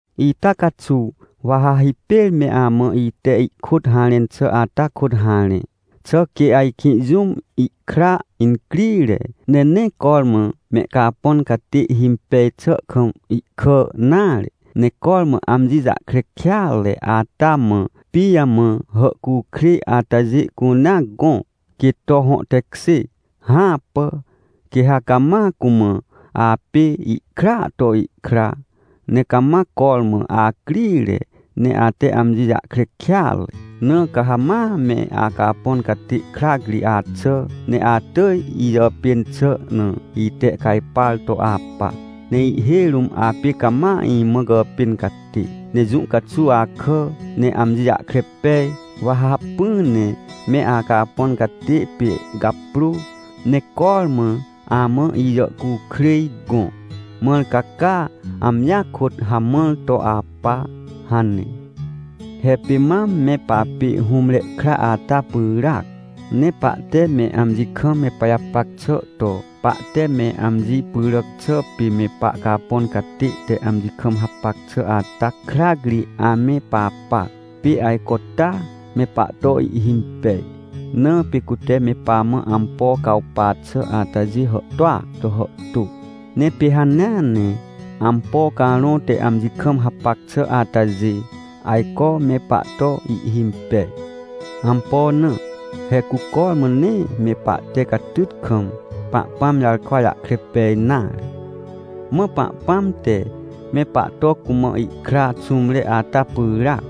Ita caxuw, wa ha hipêr me amã ite ihkôt harẽn xà ata kôt harẽ. Xà quê ajkĩ jũm, ihkra incrire, ne nee cormã mehcapõn catê himpej xà kam ihkà nare, ne cormã amji jahkre kêatre ata mã, pijamã hàhcukrêj atajê cunea gõ, quê to hõ tekjê? Hãpà! Quê ha cama cumã: — Apê ikraa to ikra, ne cama cormã acrire, ne ate amji jahkre kêatre. Na ca ha ma me acapõn catê krac ri axà, ne atỳj ijàpên xà na itehcajpar to apa, ne ihhêj rũm apê cama imã gàpên catê. Ne jũ caxuw akà, ne amji jahkre pej, wa ha hacpỹ ne me acapõn catê pê gaprô, ne cormã amã ijàhcukrêj gõ, mãr ca caa, amjia kôt hamãr to apa — hane. He pê mam me papê hũmre kra ata pyràac, ne pahte me amji kam me pajapac xà to pahte me amji pyràc xà pê me pahcapõn catê te amji kam hapac xà ata krac ri ame papa, pê ajco taa, me pahto ihhimpej. Na pê cute me pamã ampo cawpa xà atajê hàhtôa to hàhtô, ne pê hanea ne ampo carõ te amji kam hapac xà atajê, ajco me pahto ihhimpej. Ampo na? He cu cormã nee me pahte catyt kam, Pahpãm jarkwa jahkre pej nare. Mã Pahpãm te, me pahto cumã ihkra xũmre ata pyràac,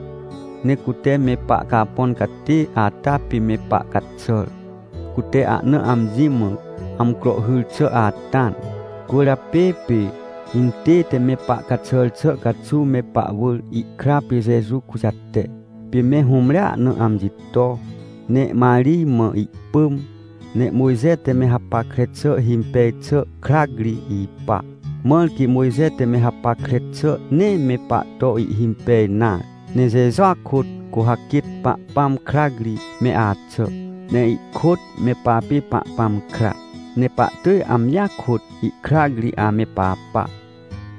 ne cute me pahcapõn catê ata pê me pahcaxàr, cute ahna amji mã amcro hyr xà ata na. Cwỳrjapê pê, intête me pahcaxàr xà caxuw me pahwỳr ihkra pê Jeju kujate, pê me hũmrea na amji to, ne Marij mã ihpỳm, ne Mojxe te me hapackre xà himpej xà krac ri ipa. Mãr quê Mojxe te me hapackre xà nee me pahto ihhimpej nare. Ne Jejua kôt, cu ha quêt Pahpãm krac ri me axà, ne ihkôt me papê Pahpãm kra, ne pahtỳj amjia kôt ihkrac ri ame papa.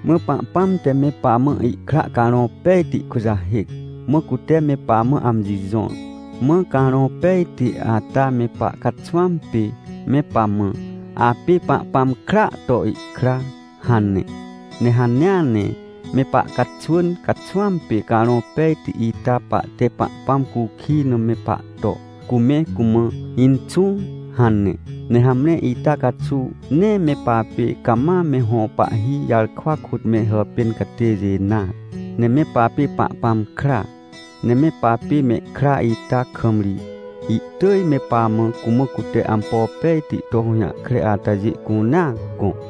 Mã Pahpãm te me pamã ihkra Carõ Pejti kujahêc, mã cute me pamã amji jõr. Mã Carõ Pejti ata me pahcaxwãm pê me pamã: — Apê Pahpãm kraa to ihkra — hane. Ne hanea ne me pahcaxwỳn caxwãm pê Carõ Pejti ita pahte Pahpãm cukij na me pahto, cu me cumã: — Inxũ — hane. Ne hamre, ita caxuw, nee me papê cama me hõ pahhi jarkwa kôt me hàpên catêjê nare, ne me papê Pahpãm kra. Ne me papê mehkra ita kam ri, ihtỳj me pamã, cumã cute ampo pejti to hũjahkre atajê cunea gõ.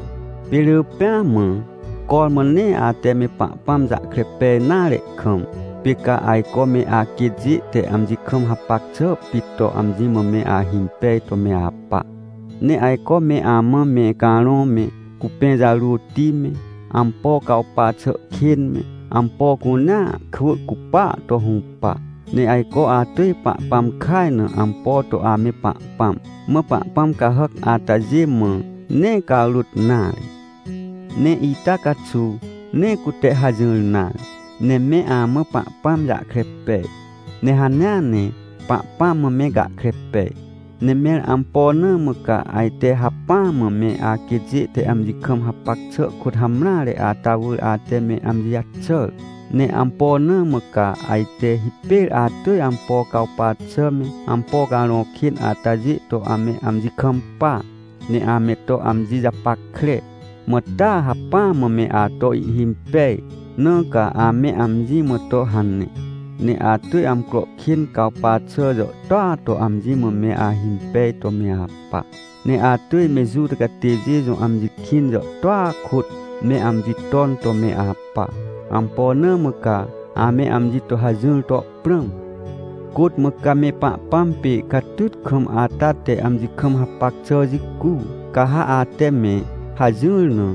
Pê rỳ pêa mã, cormã nee ate me Pahpãm jahkre pej nare kam, pê ca ajco me aquêtjê te amji kam hapac xà pit to amji mã me ahimpej to me apa. Ne ajco me amã me carõ me, cupẽ jarôti me, ampo cawpa xà kên me, ampo cunea kwỳ cupaa to hũpa. Ne ajco atỳj Pahpãm kaj na ampo to ame pahpãm. Mã pahpãm cahàc atajê mã nee carôt nare. Ne ita caxuw, nee cute hajỹr nare. Ne me amã Pahpãm jahkre pej, ne hanea ne Pahpãm mã me gahkre pej. Ne mẽr ampo na mã ca ajte hacpỹa mã me aquêtjê te amji kam hapac xà kôt hamreare ata wỳr ate me amji jaxàr? Ne ampo na mã ca ajte hipêr atỳj ampo cawpa xà me, ampo carõ kên atajê to ame amji kampa, ne ame to amji japackre? Mã taa hacpỹ mã me ato ihhimpej, na ca ame amji mã to hane? Ne atỳj amcro kên cawpa xà jàhtôa to amji mã me ahimpej to me apa. Ne atỳj me Juta catêjê jõ amji kĩn jàhtôa kôt me amji ton to me apa. Ampo na mã ca ame amji to hajỹr to prãm? Côt mã ca me Pahpãm pê catyt kam ata te amji kam hapac xà jicu? Ca ha ate me hajỹr na,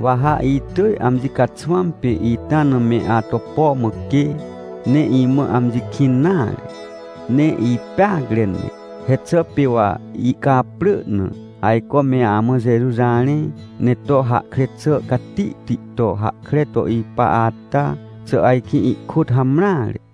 wa ha itỳj amji caxwãm pê ita na me ato po mã quê, ne imã amji kĩn nare, ne ipeacre ne. He xà pê wa ihcaprỳ na ajco me amã Jeju jarẽ, ne to hahkre xà catihti to hahkre to ipa ata, xà ajkĩ ihkôt hamreare?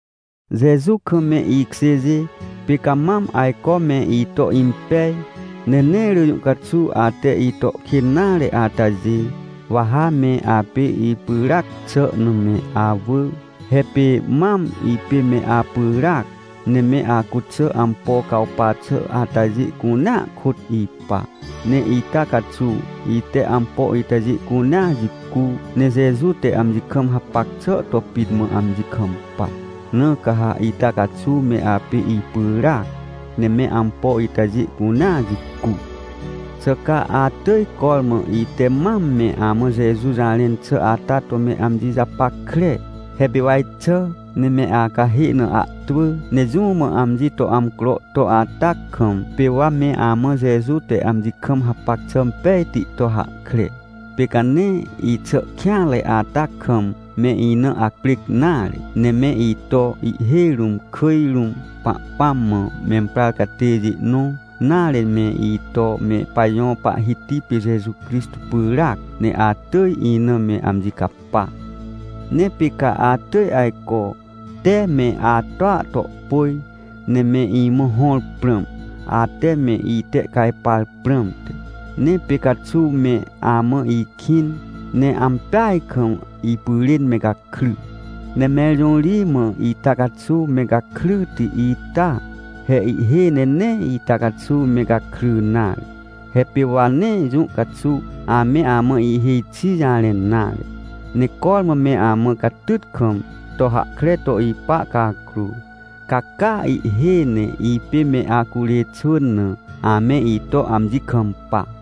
Jeju kam me ikjêjê, pê ca mam ajco me ito impej ne nee rỳ jũ caxuw ate ito kên nare atajê, wa ha me apê ipyràac xà na me awỳ. He pê mam ipê me apyràac, ne me acuxà ampo cawpa xà atajê cunea kôt ipa. Ne ita caxuw ite ampo itajê cunea jicu, ne Jeju te amji kam hapac xà to pit mã amji kampa. Na ca ha ita caxuw me apê ipyràac, ne me ampo itajê cunea jicu. Xà ca atỳj cormã ite mam me amã Jeju jarẽn xà ata to me amji japackre? He pê wa ixà, ne me acahê na ahtwỳ, ne jũ mã amji to amcro to ata kam, pê wa me amã Jeju te amji kam hapac xà pejti to hahkre. Pê ca nee ixà kêanre ata kam me ina acprêc nare, ne me ito, ihhêj rũm, kỳj rũm Pahpãm mã memprar catêjê nõ, nare, me ito me pajõ Pahhiti pê Jeju Crixtô pyràac, ne atỳj ina me amji capa. Ne pê ca atỳj ajco, tee me atoa to pôj, ne me imã hõr prãm, ate me itehcajpar prãmte. Ne pê caxuw me amã ikĩn, ne ampeaj kam ipyrên me gakry. Ne mẽr jõ ri mã ita caxuw me gakryti ita? He ihhêj ne nee ita caxuw me gakry nare. He pê wa nee jũ caxuw ame amã ihêj xi jarẽn nare, ne cormã me amã catyt kam to hahkre to ipa cakrô, ca caa ihhêj ne ipê me acurê xwỳn na, ame ito amji kampa.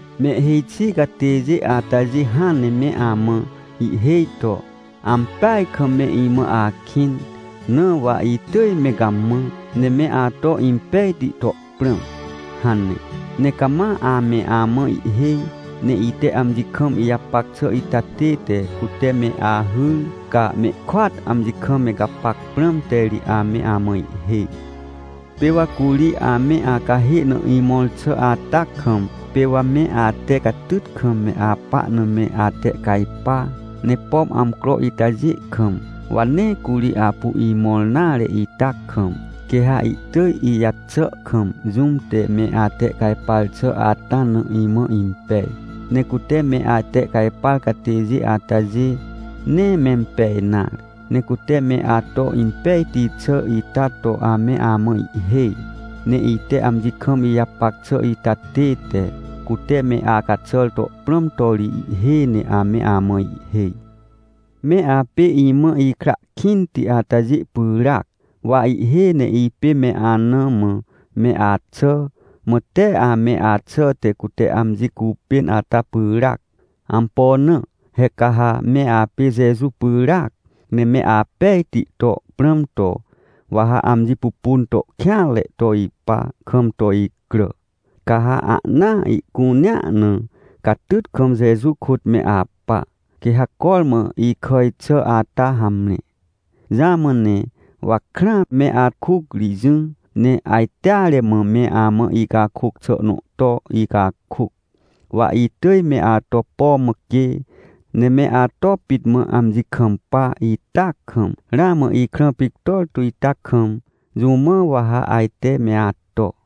Mehhêj xi catêjê atajê hãn ne me amã ihhêj to: — Ampeaj kam me imã akĩn, na wa itỳj me gamã, ne me ato impejti to prãm — hane. Ne cama ame amã ihhêj, ne ite amji kam ijapac xà ita tête cute me ahyr, ca mehkôat amji kam me gapac prãmte ri ame amã ihhêj. Pê wa curi ame acahê na imõr xà ata kam, pê wa me ate catyt kam me apa na me atehcajpa. Ne pom amcro itajê kam, wa nee curi apu imõr nare ita kam, quê ha ihtỳj ijaxà kam jũm te me atehcajpar xà ata na imã impej. Ne cute me atehcajpar catêjê atajê, nee mempej nare. Ne cute me ato impejti xà ita to ame amã ihhêj, ne ite amji kam ijapac xà ita tête, cute me acaxàr to prãm to ri, ihhêj ne ame amã ihhêj. Me apê imã ikra kĩnti atajê pyràac. Wa ihhêj ne ipê me anã mã me axà, mã tee ame axà te cute amji cupên ata pyràac. Ampo na? He ca ha me apê Jeju pyràac, ne me apejti to prãm to, wa ha amji pupun to kêanre to ipa kam to icrà, ca ha ahnaa ihcunea na, catyt kam Jeju kôt me apa, quê ha cormã ikàj xà ata hamre. Jamã ne wa krãa me akuc ri jỹ, ne ajteare mã me amã icakôc xà nõ to icakôc. Wa itỳj me ato po mã quê, ne me ato pit mã amji kampa ita kam, ramã ikrã pictor tu ita kam, jũ mã wa ha ajte me ato.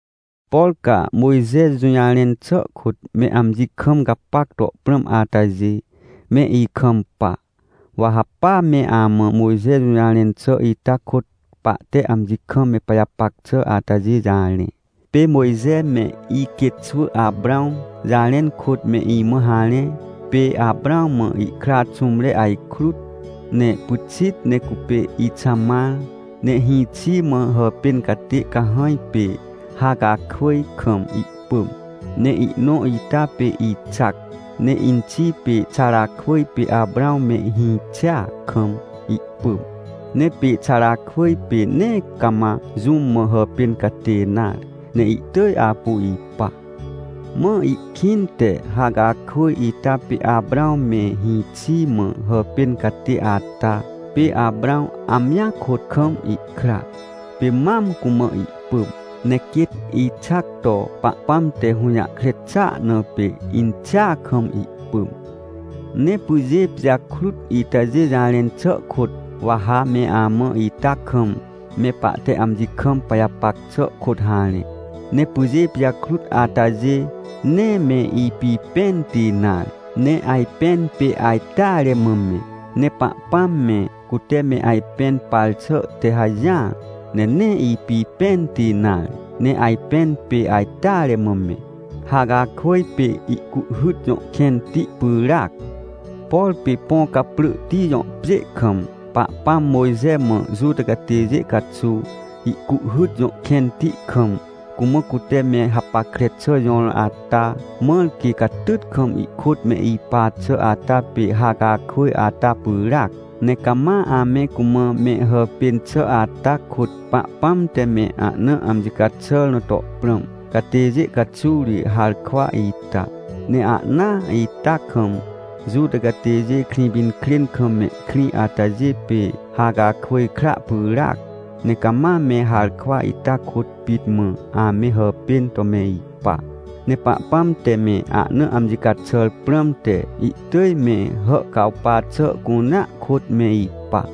Por ca Mojxe jũjarẽn xà kôt me amji kam gapac to prãm atajê, me ikampa. Wa ha pa me amã Mojxe jũjarẽn xà ita kôt pahte amji kam me pajapac xà atajê jarẽ. Pê Mojxe me iquêtxwỳ Aprãw jarẽn kôt me imã harẽ, pê Aprãw mã ihkra xũmre ajkrut. Ne pyxit ne cupê Ixamar, ne hĩxi mã hàpên catê cahãj pê Hacakwỳj kam ihpỳm. Ne ihnõ ita pê Ixac, ne inxi pê Xarakwỳj pê Aprãw me hĩxia kam ihpỳm. Ne pê Xarakwỳj pê nee cama jũm mã hàpên catê nare, ne ihtỳj apu ipa. Mã ihkĩnte Hacakwỳj ita pê Aprãw me hĩxi mã hàpên catê ata, pê Aprãw amjia kôt kam ihkra, pê mam cumã ihpỳm. Ne quêt Ixac to Pahpãm te hũjahkre xàa na pê, inxia kam ihpỳm. Ne pyjê pijakrut itajê jarẽn xà kôt, wa ha me amã ita kam me pahte amji kam pajapac xà kôt harẽ. Ne pyjê pijakrut atajê, nee me ipipẽnti nare, ne ajpẽn pê ajteare mã me. Ne Pahpãm me, cute me ajpẽn par xà te hajỹar, ne nee ipipẽnti nare, ne ajpẽn pê ajteare mã me. Hacakwỳj pê Ihcuhhyt jõ kẽnti pyràac. Por pê Põcaprỳhti jõ pjê kam, Pahpãm Mojxe mã Juta catêjê caxuw, Ihcuhhyt jõ kẽnti kam, cumã cute me hapackre xà jõr ata, mãr quê catyt kam ihkôt me ipa xà ata pê Hacakwỳj ata pyràac. Ne cama ame cumã me hàpên xà ata kôt Pahpãm te me ahna amji caxàr na to prãm catêjê caxuw ri harkwa ita. Ne ahnaa ita kam, Juta catêjê Krĩpinkrên kam mehkrĩ atajê pê Hacakwỳj kra pyràac, ne cama me harkwa ita kôt pit mã ame hàpên to me ipa. Ne Pahpãm te me ahna amji caxàr prãmte, ihtỳj me hàhcawpa xà cunea kôt me ipa.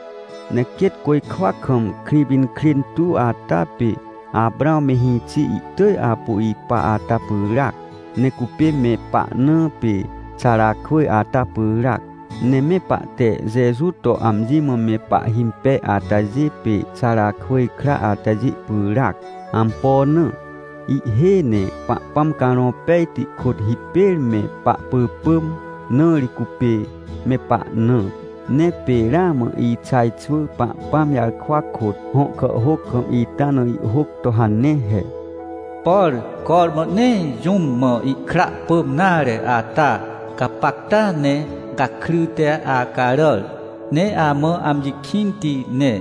Ne quêt côjkwa kam Krĩpinkrên tuw ata pê Aprãw me hĩxi ihtỳj apu ipa ata pyràac, ne cupê me pahnã pê Xarakwỳj ata pyràac. Ne me pahte Jeju to amji mã me pahhimpej atajê pê Xarakwỳj kra atajê pyràac. Ampo na? Ihhêj ne Pahpãm Carõ Pejti kôt hipêr me pahpỳpỳm, na ri cupê me pahnã. Ne pê ramã Ixaj xwỳ Pahpãm jarkwa kôt, hõ kàhhôc kam ita na ihhôc to hane he: “Por cormã nee jũm mã ihkra pỳm nare ata, gapacta ne gakryte acaràr, ne amã amji kĩnti ne.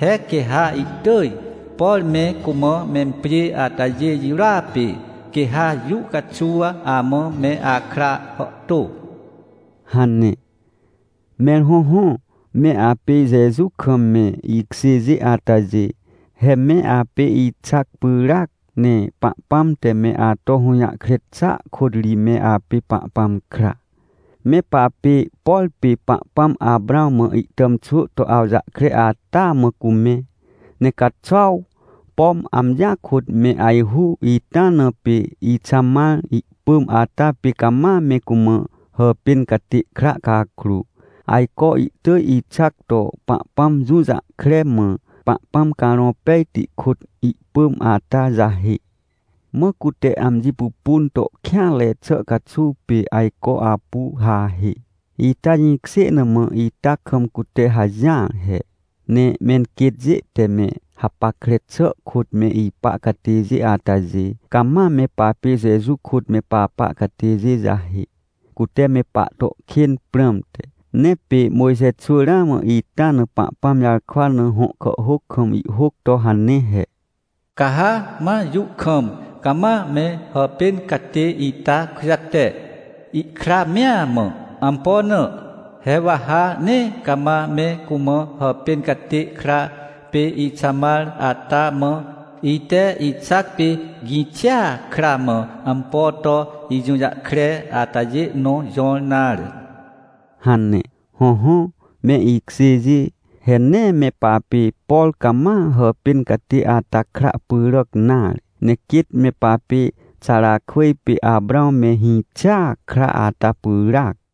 He quê ha ihtỳj, por me cumã mempjê atajê jirôa pê, quê ha jũ caxuw amã me akra hàhtô” hane. Mẽr hõhõ, me apê Jeju kam me ikjêjê atajê, he me apê Ixac pyràac, ne Pahpãm te me ato hũjahkre xàa kôt ri me apê Pahpãm kra. Me papê, por pê Pahpãm Aprãw mã ihtàmxwỳ to awjahkre ata mã cu me. Ne caxuaw, pom amjia kôt me ajhu ita na pê Ixamar ihpỳm ata pê cama me cumã hàpên catê kra cakrô, ajco ihtỳj Ixac to Pahpãm jũjahkre, mã Pahpãm Carõ Pejti kôt ihpỳm ata jahê. Mã cute amji pupun to kêanre xà caxuw pê ajco apu hahê. Ita jĩkjê na mã ita kam cute hajỹar he, ne menquêtjê te me hapackre xà kôt me ipa catêjê atajê, cama me papê Jeju kôt me papa catêjê jahê, cute me pahto kên prãmte. Ne pê Mojxe xwỳ ramã ita na Pahpãm jarkwa na hõ kàhhôc kam ihhôc to hane he: “Ca ha ma jũ kam cama me hàpên catê ita kujate, ihkra mea mã. Ampo na? He wa ha nee cama me cumã hàpên catê kra pê Ixamar ata mã, ite Ixac pê gĩxia kra mã ampo to ijũjahkre atajê nõ jõr nare” hane. Hõhõ me ikjêjê, he nee me papê, por cama hàpên catê ata kra pyràc nare. Ne quêt me papê Xarakwỳj pê Aprãw me hĩxia kra ata pyràac.